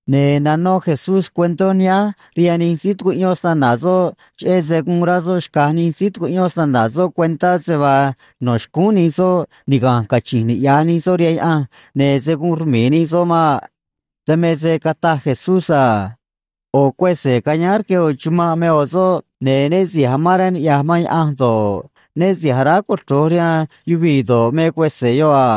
Ne̱ nanó Jesús cuentó nihánj rihaan nij síí tucuꞌyón snana̱ soꞌ, cheꞌé se guun rá soꞌ xca̱j nij síí tucuꞌyón snana̱ soꞌ cuentá se vaa no̱ xcúún nij soꞌ niga̱nj cachi̱nj niꞌya̱j nij soꞌ rihaan Yaꞌanj, ne̱ se̱ guun rmi̱i̱ nij soꞌ maꞌ. Dan me se cataj Jesús a: ―ꞌO̱ cuese̱ cayáán rque ꞌo̱ chumanꞌ me ꞌo̱ soꞌ, ne̱ né si̱j amán rá niꞌya̱j man Yaꞌanj do̱ꞌ, né si̱j aráj cochro̱j rihaan yuvii̱ do̱ꞌ, me cuese̱ yoꞌ a.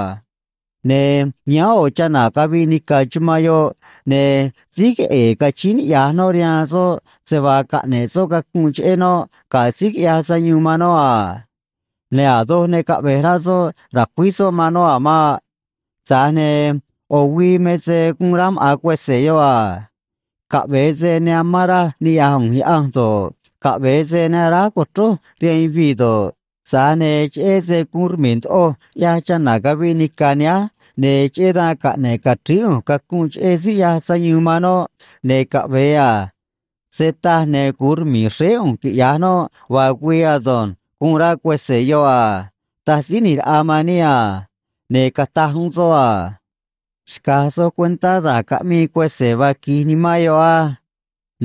Ne̱ yáán ꞌo̱ chana̱ caviꞌ nica̱ chumanꞌ yoꞌ, ne̱ síj queꞌe̱e̱ cachíín niꞌya̱j noꞌ rihaan soꞌ se vaa caꞌne̱ꞌ soꞌ cacunꞌ cheꞌé noꞌ ga̱ síí quiꞌyaj sayuun man noꞌ a. Ne̱ a̱ doj ne caꞌve̱j rá soꞌ ra̱cuíj soꞌ man noꞌ a̱ maꞌ. Tza̱j ne̱ ꞌo̱ güii me se guun rá maꞌa̱n cuese̱ yoꞌ a: “Caꞌve̱e se ne amán raj niꞌya̱j ꞌu̱nj Yaꞌanj do̱ꞌ, caꞌve̱e se ne aráj co̱chrój rihaan yuvii̱ do̱ꞌ, tza̱j ne̱ cheꞌé se guun rmi̱i̱ ndoꞌoj ꞌyaj chana̱ caviꞌ nica̱ nihánj, ne̱ cheꞌé dan caꞌne̱ꞌ ca̱chríí ꞌu̱nj cacunꞌ cheꞌé síí ꞌyaj sayuun man noꞌ, ne̱ caꞌve̱e a. Se taj, ne̱ gu̱un rmi̱i̱ xréé ꞌu̱nj, quiꞌya̱j noꞌ vaa güii ado̱nj”, guun rá cuese̱ yoꞌ a ―taj Síí ꞌNi̱j Raꞌa man níꞌ a. Ne̱ cataj uún soꞌ a: ―Xca̱j soj cuentá da̱j caꞌmii cuese̱ vaa qui̱j nimán yoꞌ á.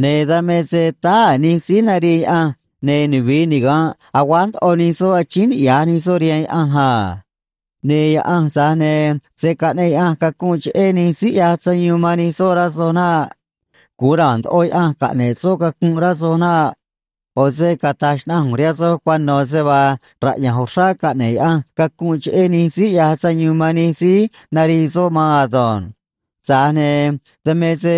Ne̱ dan me se táá a̱ nij síí narii Yaꞌanj, ne̱ nuvi̱i niga̱nꞌ aguáj ndoꞌo nij soꞌ, achíín niꞌya̱j nij soꞌ rihaan Yaꞌanj a. Ne̱ Yaꞌanj, tza̱j ne̱ se̱ caꞌneꞌ Yaꞌanj cacunꞌ cheꞌé nij síí ꞌyaj sayuun man nij soꞌ, rá soj naꞌ. Gu̱un ra̱a̱n ndoꞌo Yaꞌanj caꞌne̱ꞌ soꞌ cacunꞌ, rá soj naꞌ. ꞌO̱ se cata̱j xnaꞌanj ꞌu̱nj rihaan soj cuano̱ se vaa raꞌya̱nj uxrá caꞌne̱ꞌ Yaꞌanj cacunꞌ cheꞌé nij síí ꞌyaj sayuun man nij síí narii soꞌ maan ado̱nj. Tza̱j ne̱ dan me se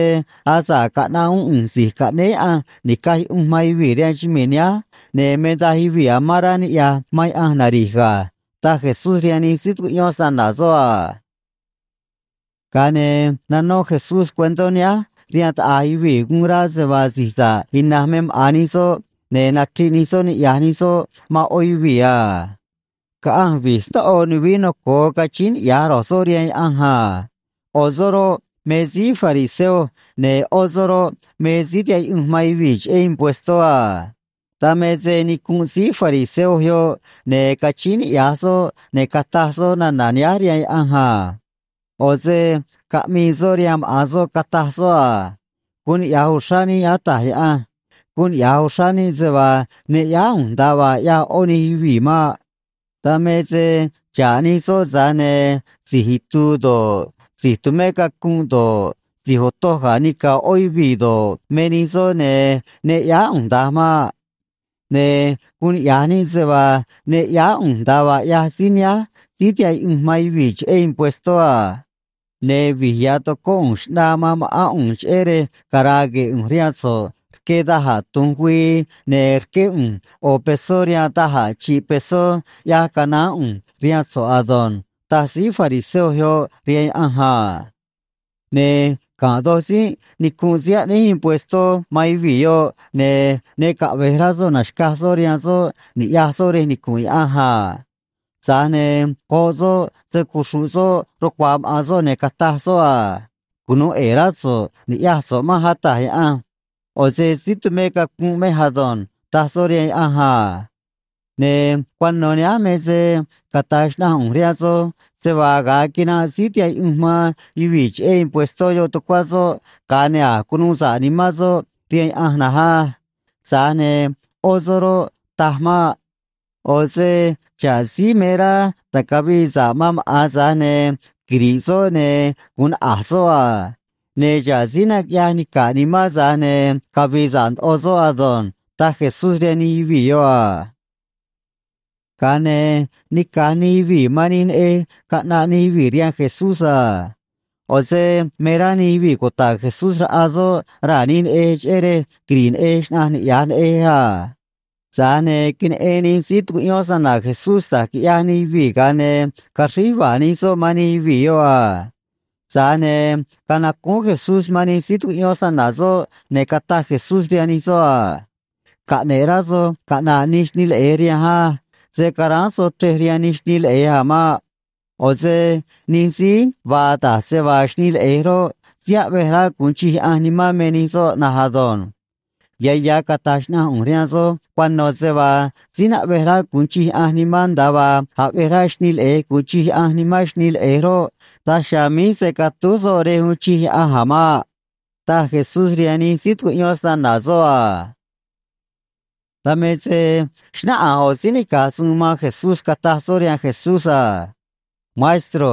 asa̱ꞌ caꞌnaꞌ uún ꞌu̱nj Si̱j Caꞌnéé Yaꞌanj Ni̱caj Yuꞌunj man Yuvii̱ rihaan chumii̱ nihánj, ne̱ me daj yuvii̱ amán rá niꞌya̱j man Yaꞌanj nari̱j ga̱ ―taj Jesús rihaan nij síí tucuꞌyón snana̱ soꞌ a. Ga̱a ne̱ nanó Jesús cuentó nihánj rihaan taꞌa̱j yuvii̱ guun rá se vaa si̱j sa̱ꞌ ina̱nj me maꞌa̱n nij soꞌ ne̱ nachriꞌ nij soꞌ niꞌya̱j nij soꞌ man ꞌó yuvii̱ a: ―Caꞌanj vi̱j snóꞌo nuvií noco̱o, cachíín niꞌya̱j ro̱j soꞌ rihaan Yaꞌanj a. ꞌO̱ soꞌ roꞌ, me síí fariseo, ne̱ ꞌó soꞌ roꞌ, me síí tihaꞌ yuꞌunj man yuvii̱ cheꞌé impuestó a. ’Dan me se nicunꞌ síí fariseo yoꞌ, ne̱ cachíín niꞌya̱j soꞌ, ne̱ cataj soꞌ nana̱ nihánj rihaan Yaꞌanj a. ꞌO̱ se caꞌmii soꞌ rihaan maꞌa̱n soꞌ, cataj soꞌ a: “Guun niꞌya̱j uxrá níꞌ, Ata̱j Yaꞌanj. Guun niꞌya̱j uxrá níꞌ se vaa ne ꞌyáá ꞌu̱nj nda̱a vaa ꞌyaj ꞌó nij yuvii̱ maꞌ. Dan me se xa̱ꞌ nij soꞌ, tza̱j ne̱ si̱j itu̱u̱ do̱ꞌ, si̱j tumé cacunꞌ do̱ꞌ, si̱j otoj ga̱ nica̱ ꞌó yuvii̱ do̱ꞌ, me nij soꞌ, ne̱ ne ꞌyáá ꞌu̱nj da̱nj maꞌ. Ne̱ guun niꞌya̱j níꞌ se vaa ne ꞌyáá ꞌu̱nj nda̱a vaa ꞌyaj síí nihánj síí tihaꞌ yuꞌunj man yuvii̱ cheꞌé impuestó a. Ne̱ vi̱j ya̱ tocóꞌ ꞌu̱nj xꞌnaa man ma̱ꞌán ꞌu̱nj cheꞌé rej cara̱a̱ gue̱e̱ ꞌu̱nj rihaan so̱ꞌ rque da̱j a̱ tu̱nj güii, ne̱ rqué ꞌu̱nj ꞌo̱ pesó rihaan da̱j a̱ chi̱ꞌ pesó ꞌyaj canaán ꞌu̱nj rihaan so̱ꞌ ado̱nj”, taj síí fariseo yoꞌ rihaan Yaꞌanj a. ’Ne̱ ga̱nꞌ do̱j tzínꞌ nicunꞌ síí aꞌnéj impuestó man yuvii̱ yoꞌ, ne̱ ne caꞌve̱j rá soꞌ na̱xcaj soꞌ rihaan soꞌ ni̱ꞌyaj soꞌ rej nicu̱nꞌ Yaꞌanj a. Tza̱j ne̱ goꞌ soꞌ se‑cuxru̱ꞌ soꞌ rucua̱a̱ maꞌa̱n soꞌ, ne̱ cataj soꞌ a: “Cunu̱u ꞌe̱e̱ rá so̱ꞌ ni̱ꞌyaj so̱ꞌ manj, Ata̱j Yaꞌanj. ꞌO̱ se si̱j tumé cacunꞌ mej ado̱nj”, taj soꞌ rihaan Yaꞌanj a. ’Ne̱ cuano̱ nihánj me se cata̱j xnaꞌanj ꞌu̱nj rihaan soj se vaa ga̱a quinanꞌ síí tihaꞌ yuꞌunj man yuvii̱ cheꞌé impuestó yoꞌ tucuá soꞌ, ga̱a ne̱ a̱j cunuu sa̱ꞌ nimán soꞌ rihaan Yaꞌanj na̱nj á. Tza̱j ne̱ ꞌó soꞌ roꞌ, taj maꞌ. ꞌO̱ se xa̱ꞌ síí me rá ta̱cavii sa̱ꞌ man maꞌa̱n, tza̱j ne̱ quiri̱ꞌ soꞌ, ne̱ gu̱un naꞌa̱j soꞌ a. Ne̱ xa̱ꞌ síí naquiꞌyaj nica̱ꞌ nimán, tza̱j ne̱ cavi̱i̱ sa̱ꞌ ndoꞌo soꞌ ado̱nj ―taj Jesús rihaan nij yuvii̱ yoꞌ a. Ga̱a ne̱ nica̱j nij yuvii̱ man nij neꞌej caꞌnaꞌ nij yuvii̱ rihaan Jesús a. ꞌO̱ se me rá nij yuvii̱ cuta̱ꞌ Jesús raꞌa soꞌ raa̱ nij neꞌej cheꞌé rej quiri̱ꞌ neꞌej xnaꞌanj niꞌya̱j neꞌej a. Tza̱j ne̱ queneꞌen nij síí tucuꞌyón snana̱ Jesús da̱j quiꞌyaj nij yuvii̱, ga̱a ne̱ caxríj yuva̱a̱ nij soꞌ man nij yuvii̱ yoꞌ a. Tza̱j ne̱ canacúún Jesús man nij síí tucuꞌyón snana̱ soꞌ, ne̱ cataj Jesús rihaan nij soꞌ a: ―Caꞌne̱ꞌ rá soj caꞌna̱ꞌ nij xnii leꞌe̱j rihanj á. Se̱ caráán soj chrej rihaan nij xnii leꞌe̱j a̱ maꞌ. ꞌO̱ se nij síí vaa da̱j se vaa xnii leꞌe̱j roꞌ, síí aꞌvej rá gu̱un chij Yaꞌanj nimán me nij soꞌ na̱nj ado̱nj. Ya̱ ya̱ cata̱j xnaꞌanj ꞌu̱nj rihaan soj cuano̱ se vaa síí naꞌvej rá gu̱un chij Yaꞌanj nimán, nda̱a vaa aꞌvej rá xnii leꞌe̱j gu̱un chij Yaꞌanj nimán xnii leꞌe̱j roꞌ, daj chiha̱a̱ míj se̱ catúj soꞌ rej uun chij Yaꞌanj a̱ maꞌ ―taj Jesús rihaan nij síí tucuꞌyón snana̱ soꞌ a. Dan me se xnáꞌanj ꞌo̱ síí nica̱j suun man Jesús, cataj soꞌ rihaan Jesús a: ―Maestro,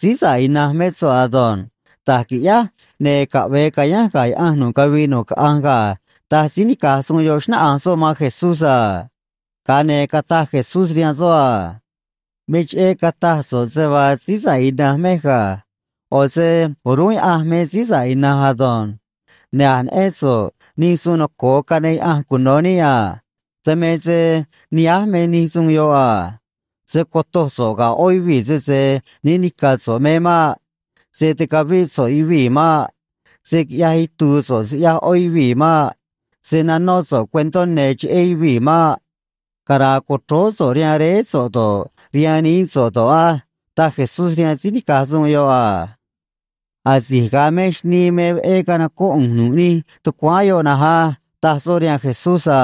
síí sa̱ꞌ ina̱nj mé so̱ꞌ ado̱nj. Da̱j qui̱ꞌyáj, ne̱ caꞌve̱e ca̱yánj ga̱ Yaꞌanj nu̱ꞌ cavii nu̱ꞌ caꞌanj ga̱ ―taj síí nica̱j suun yoꞌ, xnáꞌanj soꞌ man Jesús a. Ga̱a ne̱ cataj Jesús rihaan soꞌ a: ―Me cheꞌé cataj so̱ꞌ se vaa síí sa̱ꞌ ina̱nj mej ga̱. ꞌO̱ se o̱rúnꞌ Yaꞌanj me síí sa̱ꞌ ina̱nj ado̱nj. Ne̱ a̱j neꞌén so̱ꞌ nij suun noco̱o caꞌneꞌ Yaꞌanj cuno̱ níꞌ a. Dan me se nihánj me nij suun yoꞌ a: “Se̱ cotoj so̱ꞌ ga̱ ꞌó yuvii̱ sese né ni̱ca̱ so̱ꞌ me maꞌ. Se̱ ticavíꞌ so̱ꞌ yuvii̱ maꞌ. Se̱ quiꞌyaj itu̱u̱ so̱ꞌ siꞌyaj ꞌó yuvii̱ maꞌ. Se̱ nanó so̱ꞌ cuentó ne̱ cheꞌé yuvii̱ maꞌ. Cara̱a̱ co̱chróó so̱ꞌ rihaan réé so̱ꞌ do̱ꞌ, rihaan nií so̱ꞌ do̱ꞌ á” ―taj Jesús rihaan síí nica̱j suun yoꞌ a. ―Asi̱j ga̱a mej xnii me veꞌé canocóꞌ ꞌu̱nj nu̱ꞌ nij tucuáán yoꞌ na̱nj á ―taj soꞌ rihaan Jesús a.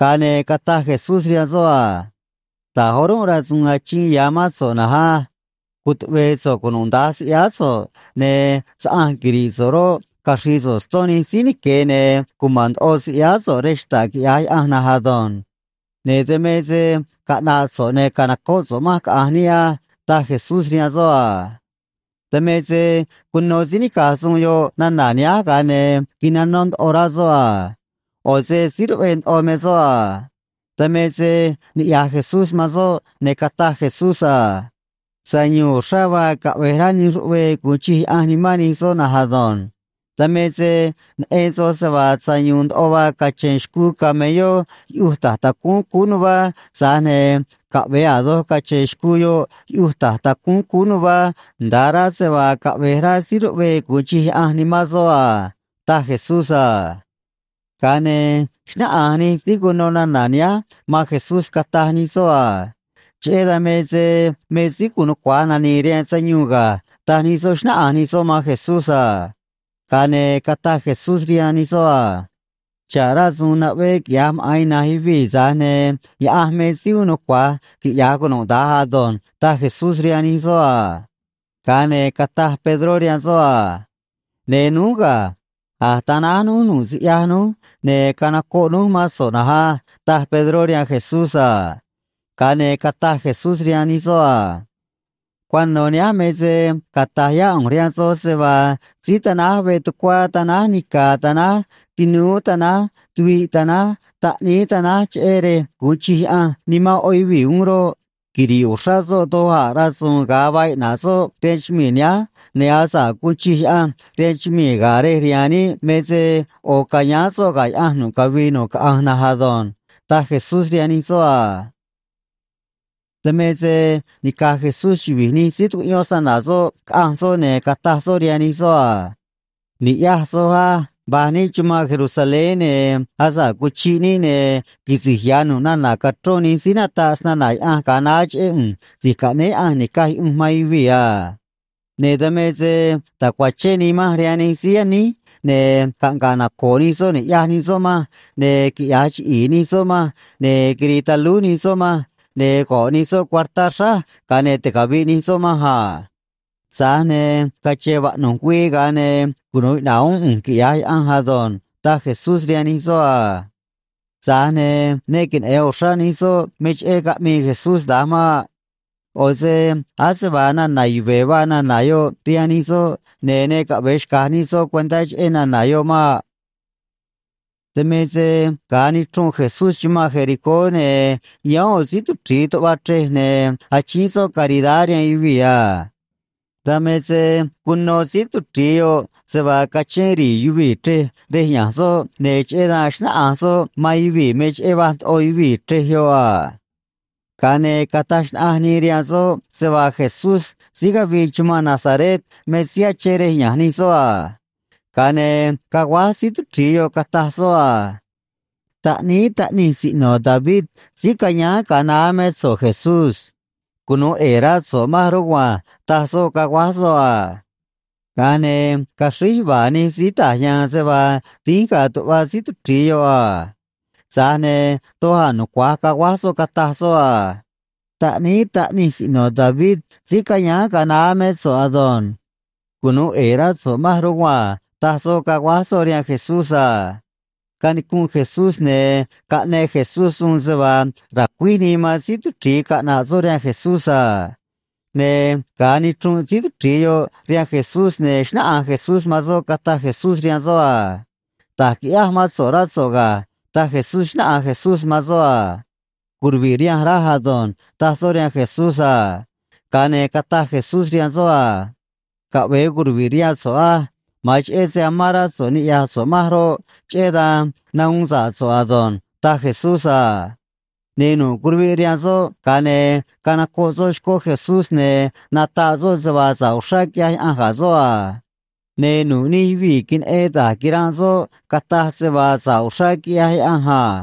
Ga̱a ne̱ cataj Jesús rihaan soꞌ a: ―Da̱j o̱rúnꞌ rasu̱u̱n achiin ya̱ mán so̱ꞌ na̱nj á. Cutuꞌve̱e̱ so̱ꞌ cunuda̱nj siꞌyáá so̱ꞌ, ne̱ saꞌanj quiri̱ꞌ so̱ꞌ roꞌ, caxri̱i̱ so̱ꞌ ston nij síí nique̱, ne̱ cuma̱n ndoꞌo siꞌyáá so̱ꞌ rej xta̱ꞌ, quiꞌya̱j Yaꞌanj na̱nj ado̱nj. Ne̱ dan me se caꞌna̱ꞌ so̱ꞌ, ne̱ ca̱nocóꞌ so̱ꞌ manj, caꞌa̱nj níꞌ á ―taj Jesús rihaan soꞌ a. Dan me se cuno síí nica̱j suun yoꞌ nana̱ nihánj, ga̱a ne̱ quinanó ndoꞌo rá soꞌ a. ꞌO̱ se síí ruꞌvee ndoꞌo me soꞌ a. Dan me se niꞌya̱j Jesús man soꞌ, ne̱ cataj Jesús a: ―Sayu̱u̱n uxrá vaa caꞌve̱j rá nij ruꞌvee gu̱un chij Yaꞌanj nimán nij soꞌ na̱nj ado̱nj. Dan me se neꞌen soj se vaa sayu̱u̱n ndoꞌo vaa cache̱n xcuu camelló yuꞌuj ta̱j tacúún cúú nuvá, tza̱j ne̱ caꞌve̱e a̱ doj cache̱n xcuu yoꞌ yuꞌuj ta̱j tacúún cúú nuvá, nda̱a rá se vaa caꞌve̱j rá síí ruꞌvee gu̱un chij Yaꞌanj nimán soꞌ a ―taj Jesús a. Ga̱a ne̱ xnáꞌanj nij síí cuno nana̱ nihánj man Jesús, cataj nij soꞌ a: ―Cheꞌé dan me se me síí gu̱un nucua̱j nani̱i̱ rihaan sayuun ga̱ ―taj nij soꞌ, xnáꞌanj nij soꞌ man Jesús a. Ga̱a ne̱ cataj Jesús rihaan nij soꞌ a: ―Xa̱ꞌ rasu̱u̱n naꞌvee quiꞌya̱j maꞌa̱n ina̱nj yuvii̱, tza̱j ne̱ Yaꞌanj me síí uun nucua̱j quiꞌya̱j cunuda̱nj ado̱nj ―taj Jesús rihaan nij soꞌ a. Ga̱a ne̱ cataj Pedró rihaan soꞌ a: ―Ne̱ núj ga̱. A̱j tanáj núj nu̱ꞌ siꞌyaj núj, ne̱ canocoꞌ núj mán so̱ꞌ na̱nj á ―taj Pedró rihaan Jesús a. Ga̱a ne̱ cataj Jesús rihaan nij soꞌ a: ―Cuano̱ nihánj me se cata̱j yá ꞌu̱nj rihaan soj se vaa síí tanáj veꞌ tucuá tanáj nica̱ tanáj tinúú tanáj tuviꞌ tanáj taꞌníí tanáj, cheꞌé rej gu̱un chij Yaꞌanj nimán ꞌó yuvii̱ uún roꞌ, quiri̱ꞌ uxrá soꞌ doj a̱ rasu̱u̱n ga̱a vaa iꞌna̱ꞌ soꞌ rihaan chumii̱ nihánj, ne̱ asa̱ꞌ guun chij Yaꞌanj rihaan chumii̱ ga̱a̱ rej rihaan níꞌ me se ꞌo̱ ca̱yáán soꞌ ga̱ Yaꞌanj nu̱ꞌ cavii nu̱ꞌ caꞌanj na̱nj ado̱nj ―taj Jesús rihaan nij soꞌ a. Dan me se nica̱j Jesús chuvi̱j nij síí tucuꞌyón snana̱ soꞌ caꞌanj soꞌ, ne̱ cataj soꞌ rihaan nij soꞌ a: ―Ni̱ꞌyaj soj á. Va̱j níꞌ chumanꞌ Jerusalén, ne̱ asa̱ꞌ cuchiꞌ níꞌ, ne̱ quisi̱j ya̱ nu̱ꞌ nana̱ cachrón nij síí nataꞌ snana̱ Yaꞌanj ga̱a naá cheꞌé ꞌu̱nj Si̱j Caꞌnéé Yaꞌanj Ni̱caj Yuꞌunj man Yuvii̱ a. Ne̱ dan me se ta̱cuachén nii manj rihaan nij síí yaníj, ne̱ caꞌnga̱ꞌ naco̱o̱ nij soꞌ ni̱ꞌyaj nij soꞌ manj, ne̱ quiꞌya̱j chiꞌi̱i̱ nij soꞌ manj, ne̱ quiri̱i̱ talúj nij soꞌ manj, ne̱ go̱ꞌ nij soꞌ cuartá xráj, ga̱a ne̱ ticavi̱ꞌ nij soꞌ manj a. Tza̱j ne̱ cache̱n vaꞌnu̱j güii, ga̱a ne̱ cunu̱u iꞌna̱ꞌ uún ꞌu̱nj, quiꞌya̱j Yaꞌanj ado̱nj ―taj Jesús rihaan nij soꞌ a. Tza̱j ne̱ ne queneꞌe̱n uxrá nij soꞌ me cheꞌé caꞌmii Jesús da̱nj maꞌ. ꞌO̱ se ase vaa nana̱ yuve̱ vaa nana̱ yoꞌ rihaan nij soꞌ, ne̱ ne caꞌve̱e xca̱j nij soꞌ cuentá cheꞌé nana̱ yoꞌ maꞌ. Dan me se ga̱a nichrunꞌ Jesús chumanꞌ Jericó, ne̱ yáán ꞌo̱ síí tuchri̱i tuꞌva chrej, ne̱ achíín soꞌ caridad rihaan yuvii̱ a. Dan me se cuno síí tuchri̱i yoꞌ se vaa cachén ri̱i̱ yuvii̱ chrej rej ya̱nj soꞌ, ne̱ cheꞌé dan xnáꞌanj soꞌ man yuvii̱ me cheꞌé va̱j ndoꞌo yuvii̱ chrej yoꞌ a. Ga̱a ne̱ cataj xnaꞌanj nii rihaan soꞌ se vaa Jesús síí cavii chumanꞌ Nazaret me síí achén rej ya̱nj nij soꞌ a. Ga̱a ne̱ caguáj síí tuchri̱i yoꞌ, cataj soꞌ a: ―Taꞌníí Taꞌnij Siꞌno̱ David síí cayáán ga̱a naá mé so̱ꞌ, Jesús. Cunu̱u ꞌe̱e̱ rá so̱ꞌ manj rugua̱nj ―taj soꞌ, caguáj soꞌ a. Ga̱a ne̱ caxríj yuva̱a̱ nij síí ta̱j ya̱a̱n se vaa dínj ga̱a̱ tuꞌva síí tuchri̱i yoꞌ a. Tza̱j ne̱ doj a̱ nucua̱j caguáj soꞌ, cataj soꞌ a: ―Taꞌníí Taꞌnij Siꞌno̱ David síí cayáán ga̱a naá mé so̱ꞌ ado̱nj. Cunu̱u ꞌe̱e̱ rá so̱ꞌ manj rugua̱nj ―taj soꞌ, caguáj soꞌ rihaan Jesús a. Canicunꞌ Jesús, ne̱ caꞌneꞌ Jesús suun se vaa ra̱cuíj nii man síí tuchri̱i caꞌna̱ꞌ soꞌ rihaan Jesús a. Ne̱ ga̱a nichrunꞌ síí tuchri̱i yoꞌ rihaan Jesús, ne̱ xnáꞌanj Jesús man soꞌ, cataj Jesús rihaan soꞌ a: ―Da̱j qui̱ꞌyáj mán so̱ꞌ, rá so̱ꞌ ga̱ ―taj Jesús, xnáꞌanj Jesús man soꞌ a. ―Curuvi̱ꞌ rihanj raj ado̱nj ―taj soꞌ rihaan Jesús a. Ga̱a ne̱ cataj Jesús rihaan soꞌ a: ―Caꞌve̱e curuvi̱ꞌ rihaan so̱ꞌ á. Ma̱an cheꞌé se amán rá so̱ꞌ niꞌya̱j so̱ꞌ manj roꞌ, cheꞌé dan nahuun sa̱ꞌ so̱ꞌ ado̱nj ―taj Jesús a. Ne̱ nu̱ꞌ curuviꞌ rihaan soꞌ, ga̱a ne̱ canocoꞌ soꞌ xcó Jesús, ne̱ nataꞌ soꞌ se vaa sa̱ꞌ uxrá quiꞌyaj Yaꞌanj ga̱ soꞌ a. Ne̱ nu̱ꞌ nij yuvii̱ queneꞌen da̱j quiranꞌ soꞌ cataj se vaa sa̱ꞌ uxrá quiꞌyaj Yaꞌanj a.